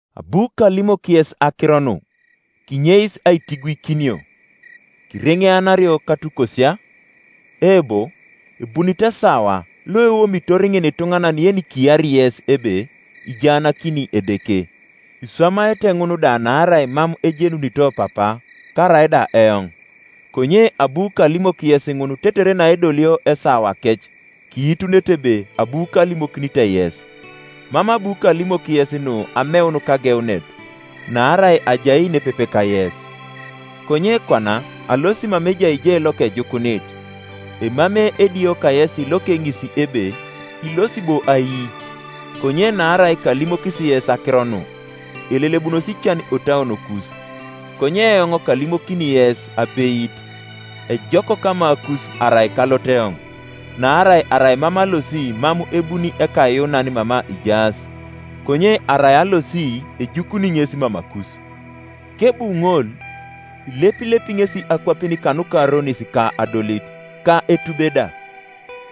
“Abu kalimok yes akiro nu, kinyeis aitiguikinio. Kireŋeanario katukosia; eebo, ebunit esawa loeomitor ŋinituŋanan yenikiari yes ebe ijaanakini Edeke. Iswamaete ŋun da naarai mam ejenunito Papa, karaida eoŋ. Konye abu kalimok yes ŋun tetere naedolio esawakec, kiitunete ebe abu kalimokinite yes. Mam abu kalimok yes nu ameun kageunet, naarai ajai nepepe kayes. “Konye kwana alosi mama ejai je lokejukunit; emamei edio kayesi lokeŋisi ebe, ‘Ilosi bo ai?’ Konye naarai kalimokis yes akiro nu, elelebunos ican otauonokus. Konye eoŋ kalimokini yes abeit; ejok kamakus arai kalot eoŋ, naarai arai mam alosi mam ebuni Ekayuunan mama ijaas; konye arai alosi ejukuni ŋes mamakus. Kebu ŋol, ilepilepi ŋesi akwapin kanuka aronis ka adolit, ka etube da.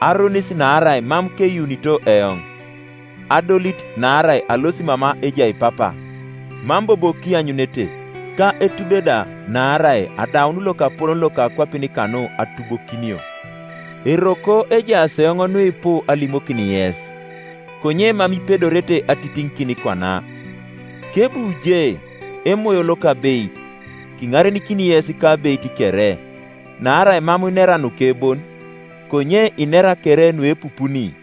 Aronis, naarai mam keyuunito eoŋ; adolit, naarai alosi mama ejai Papa, mam bobo kianyunete; ka etube da, naarai adaun lokapolon loka akwapin kanu atubokinio. “Eroko ejaas eoŋ nuipu alimokin yes, konye mam ipedorete atitiŋikin kwana. Kebu je, Emoyo loka abeit, kiŋarenikini yes kabeit kere; naarai mam inera nuke bon, konye inera kere nuepupuni,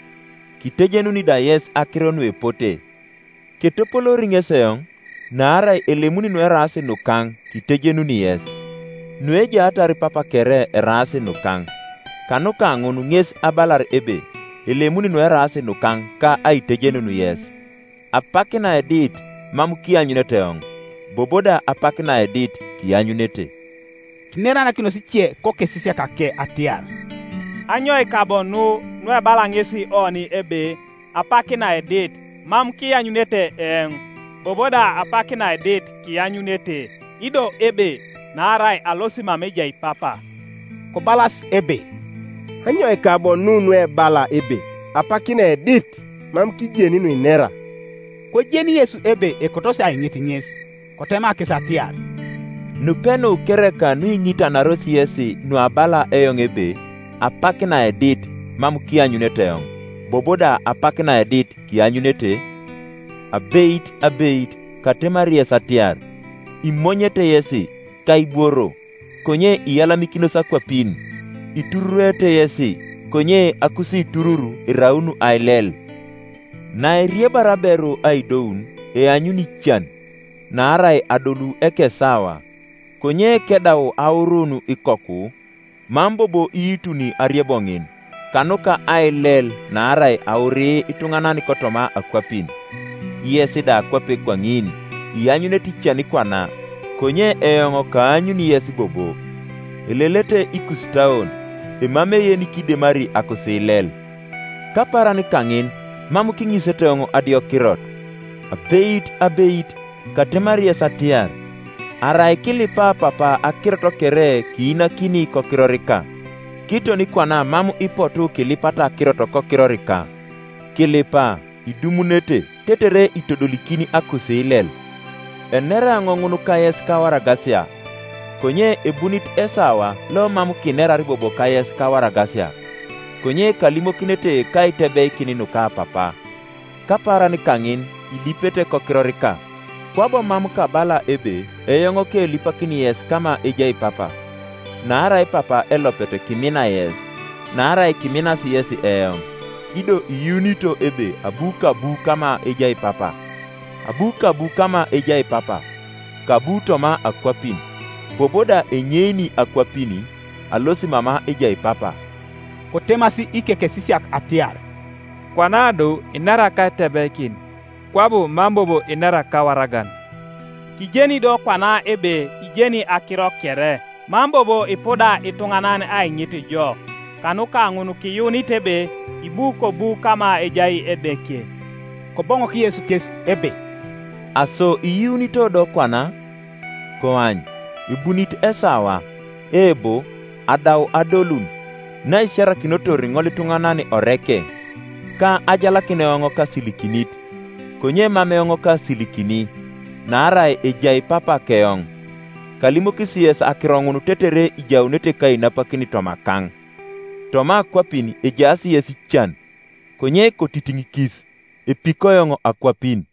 kitejenuni da yes akiro nuepote. Ketopoloori ŋesi eoŋ, naarai elemuni nueraas nukaŋ kitejenuni yes. Nuejaatar Papa kere eraas nukaŋ; kanuka ŋun ŋes abalar ebe elemuni nueraas nukaŋ ka aitejenun yes. “Apak naedit, mam kianyunete eoŋ; bobo da apak naedit, kianyunete.” Kineranakinos ice kokesisiakake atiar, “Anyoika bo nu nuebala ŋesi oni ebe, ‘Apak naedit, mam kianyunete eoŋ, bobo da apak naedit, kianyunete’; ido ebe, ‘Naarai alosi mama ejai Papa’?” Kobalas ebe, “Anyoika bo nu nuebala ebe, ‘Apak naedit’? Mam kijeni nuinera.” Kojeni Yesu ebe ekotosi aiŋit ŋes; kotema kes atiar, “Nupenu kereka nuiŋitanaros yesi nuabala eoŋ ebe, ‘Apak naedit, mam kianyunete eoŋ, bobo da apak naedit kianyunete’? Abeit, abeit, katemari yes atiar, Imonyete yesi, ka aibworo, konye iyalamikinos akwapin; itururwete yesi, konye akusiiturur eraun ailel. Naeriebar aberu aidoun eanyuni ican, naarai adolu ekesawa; konye kedau auruun ikoku, mam bobo iituni ariebo ŋin, kanuka ailel! naarai aurii ituŋanan kotoma akwapin. Yes da, kwape kwaŋin ianyunete ican kwana, konye eoŋ kaanyuni yes bobo, elelete ikusitauon, emamei yenikidemari akusiilel. Kapaaran kaŋin mam kiŋisete eoŋ adiokirot. Abeit, abeit, katemari yes atiar, Arai kilipa Papa akirot kere kiinakini kokirorika. Kiton kwana mam ipotu kilipata akirot kokirorika; kilipa, idumunete tetere itodolikin akusiilel. “Enera eoŋ ŋun kayes kawaragasia; konye ebunit esawa lomam kinerar bobo kayes kawaragasia, konye kalimokinete kaitebeikin nuka Papa. Kapaaran kaŋin ilipete kokirorika; kwabo mam kabala ebe eoŋ kelipakini yes kama ejai Papa; naarai Papa elopet kimina yes, naarai kiminasi yesi eoŋ, ido iyuunito ebe abu kabu kama ejai Papa. Abu kabu kama ejai Papa, kabu toma akwapin; bobo da enyeini akwapin, alosi mama ejai Papa.” Kotemasi ikekesisiak atiar, “Kwana do inera kaitebeikin, kwabo mam bobo inera kawaragan. Kijeni do kwana ebe ijeni akiro kere, mam bobo ipuda ituŋanan aiŋit jo; kanuka ŋun kiyuunit ebe ibu kobu kama ejai Edeke.” Koboŋok Yesu kes ebe, “Aso iyuunito do kwana? Koany, ebunit esawa, eebo, adau adolun, naisiarakinotor ŋolituŋanan oreke, ka ajalakin eoŋ kasilikinit, Konye mam eoŋ kasilikini, naarai ejai Papa keoŋ. Kalimokis yes akiro ŋun tetere ijaunete kainapakin tomakaŋ, Toma akwapin ejaas yes ican; konye kotitiŋikis, epiko eoŋ akwapin.”